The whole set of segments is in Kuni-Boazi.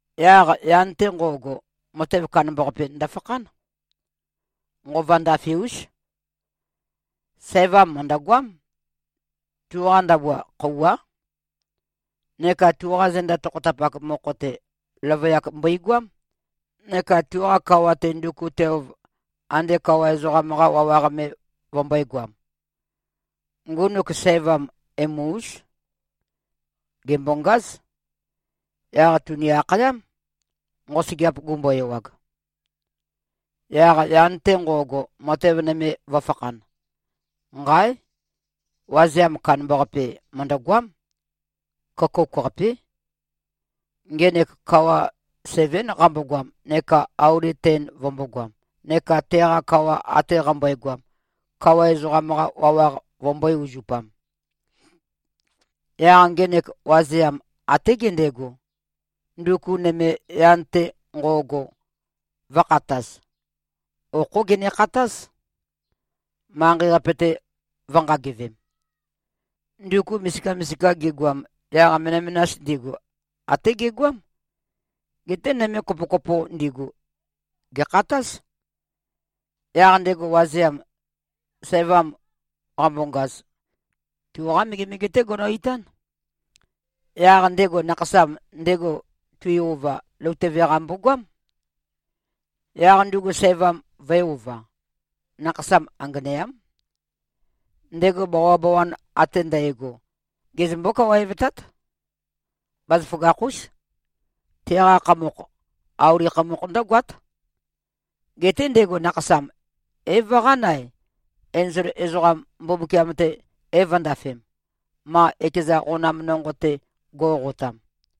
Yaq yan-te nqo꞉go, matev kandambaqape ndøfakhán. Nqova ndafe-ús. Sævam mø̀ndøgoám. Tuqa ndabua, khøuwá. Neka tuqa zenda tokhotapak mokho-te, løvøyak mbøigoám neka tuqa kawa-te, nduku tuelv, ande kawa ezoqam-qa wawaq me vømbø̄egoam. Ngunuk sævam, emu-ús. Gèmbongáz. Yaq tùni-akhayám, nqosøgeap gumbo-ewag. Yaq yan-te nqo꞉go, matev nøme vø̄fakhan. Nqáe! Wazeam kandambaqape, mø̀ndøgoám. Køkouk-qapé. Ngenek kawa sevén qambogoam neka auli ten vømbōgoam, neka teqa kawa ate qambøegoam, kawa ezoqam-qa wawaq vømbø̄e-uzupam. Yaq ngenek wazeam, até gendego, nduku nøme yan-te nqo꞉go, vø̄khataz. Okhó genekhatáz, manqei-qape-te vø̄nqagevem. Nduku misika-misika gigoam, yaq menømenas ndigu, até gegoám, geté nøme kopo-kopo ndigu, gèkhatáz. Yaq ndego wazeam, sævam qambongaz, tuqá megemege-té gono-itán. Yaq ndego nakhasam ndego, tui-ova, løutøve-qa mbogoám. Yaq ndugu sævam vø̄e-ova. Nakhasam anganeám. Ndego bawabawan ate ndægo, gezømbó-kawaevtát. Bazaføgakh-ús. Teqa khamokh, auli khamokh ndǿgoát. Geté ndego nakhasam é-vøqán-ae, enzol ezoqam, Mbumbukiam-te é-vø̄ndafem, ma ekeza qonam nonqo-te go꞉qotam.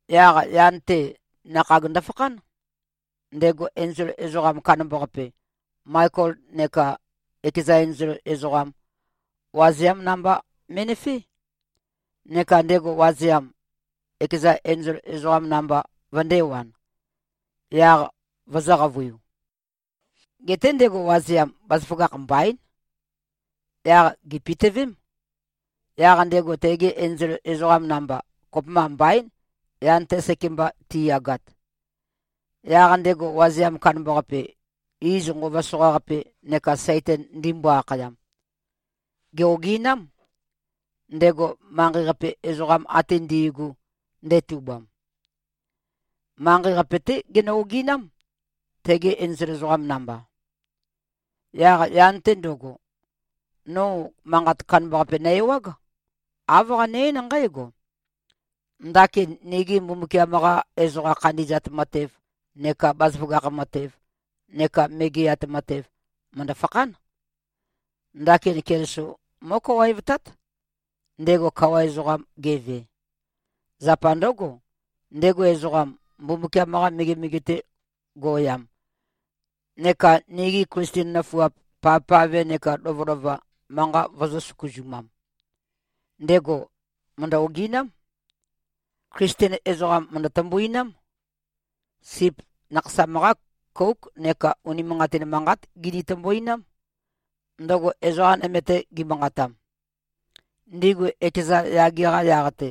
Yaq yan-te, nakhag ndøfakhán. Ndego enzol ezoqam kandambaqape, Maekol neka ekeza enzol ezoqam, wazeám namba me꞉nøfé. Neka ndego wazeam, ekeza enzol ezoqam namba vøndēwan, yaq vøzø̄-qavøiu. Geté ndego wazeam, bazaføgakh mbaín. Yaq gèpitøvém, yaq ndego tegi enzol ezoqam namba, kopømba mbaín, yan-te sekemba tiyagat. Yaq ndego wazeam kandambaqape, iz Nqova Soqaqape neka Saitan ndimbo-akhayam, gè-oginám, ndego manqei-qape ezoqam ate ndi꞉gu, ndetubam. Manqei-qape-té genø-oginám, tegi enzol ezoqam namba. Yaq yan-te ndøgo, no manqat kandambaqape nø-ewág. Āv qane-eín nqǽgo, “Ndakin nigi Mbumbukiam-qa ezoqa khandi꞉zat matev neka bazaføgakh matev neka megeat matev, mø̀ndø-fakhán. Ndakin Keliso mó꞉kawaevtát, ndego kawa ezoqam geve. Zapa ndǿgo, ndego ezoqam, Mbumbukiam-qa megemege-te go꞉yam neka nigi Klisten nøfuap, pavpave nekā lovølova, manqa vøzø̄-søkuzumam, ndego mø̀ndø-oginám. Klisten ezoqam mø̀ndø-tømbuinám. Sip Nakhasam-qá kóuk neka unimanqatin manqát gini-tømbuinám, ndøgo ezoqa nøme-te gimanqatam. Ndigu ekeza yage-qa yaq-te,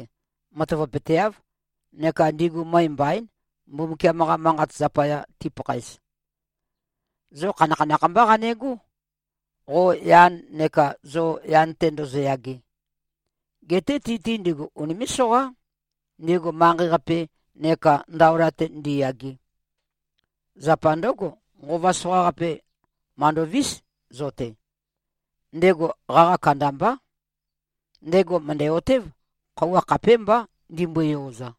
matavapøteáv, neka ndigu møe mbaín, Mbumbukiam-qa Manqat zapaya, tipakhaez. Zo khanakhanakh mbá qanegó, qo yan neka zo yan-te ndozoyage. Geté ti-te ndigu unimé꞉-soqá, ndigu manqei-qape neka ndaola-te ndiyage. Zapa ndǿgo, nqova soqaqape màndovís zo-te. Ndego qaqa kandambá. Ndego mø̀ndæ-otév, khøuwa khapémbá, ndimbøe-yoza.”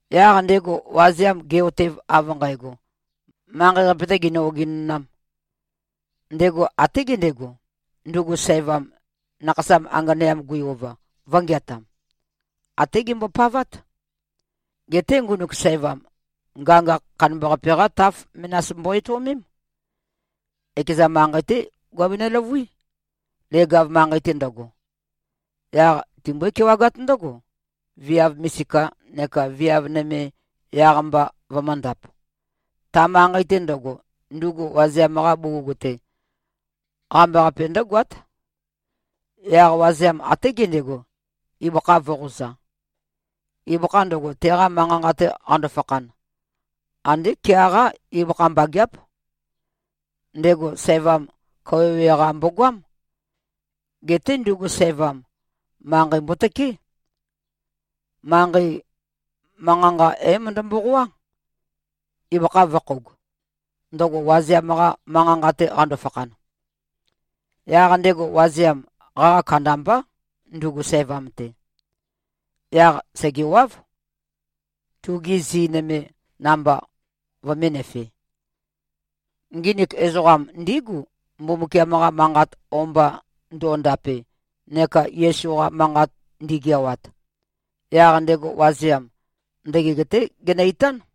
Yaq ndego wazeam ge꞉-otev av nqægo, manqei-qape-tē ginø-ogenonām, ndego até gendego, ndugu sævam, nakhasam anganeam gui-ova, vø̄ngeatam. Até gembopavát. Geté ngunuk sævam, ngangakh kandambaqape-qá taf menas mbo-etøomém. Ekeza manqei-té guabenø-løvuí, leg-av manqei-te ndøgo. Yaq timbó-kewagát ndǿgo, viav misika neka viav nøme yaq-mba vømǿndāp. Ta manqei-te ndøgo, ndugu wazeam-qa bugug-te, qambaqape ndǿgoát. Yaq wazeam, até gendego, ibøkha vø̄qoza. Ibøkha ndøgo, teqa manqa-nqa-te qando-fakhan, andé kea-qá ibøkha mbageáp. Ndego sævam kawøwe-qa mbogoám. Geté ndugu sævam, manqei mbotøké. Manqei manqa-nqa é-møndø-mboqoá, ibøkha vø̄khoug, ndøgo wazeam-qa manqa-nqa-te qando-fakhan. Yaq ndego wazeam, qaqa kandambá, ndugu sævam-te. Yaq sègewáv, tugi zi nøme namba vømēnøfe. Nginik ezoqam ndígu, Mbumbukiam-qa manqat o-mba ndo꞉ndape neka Yesu-qa manqat ndīgēāwāt. Yaq ndego wazeam, ndøgeg-té genø-itán.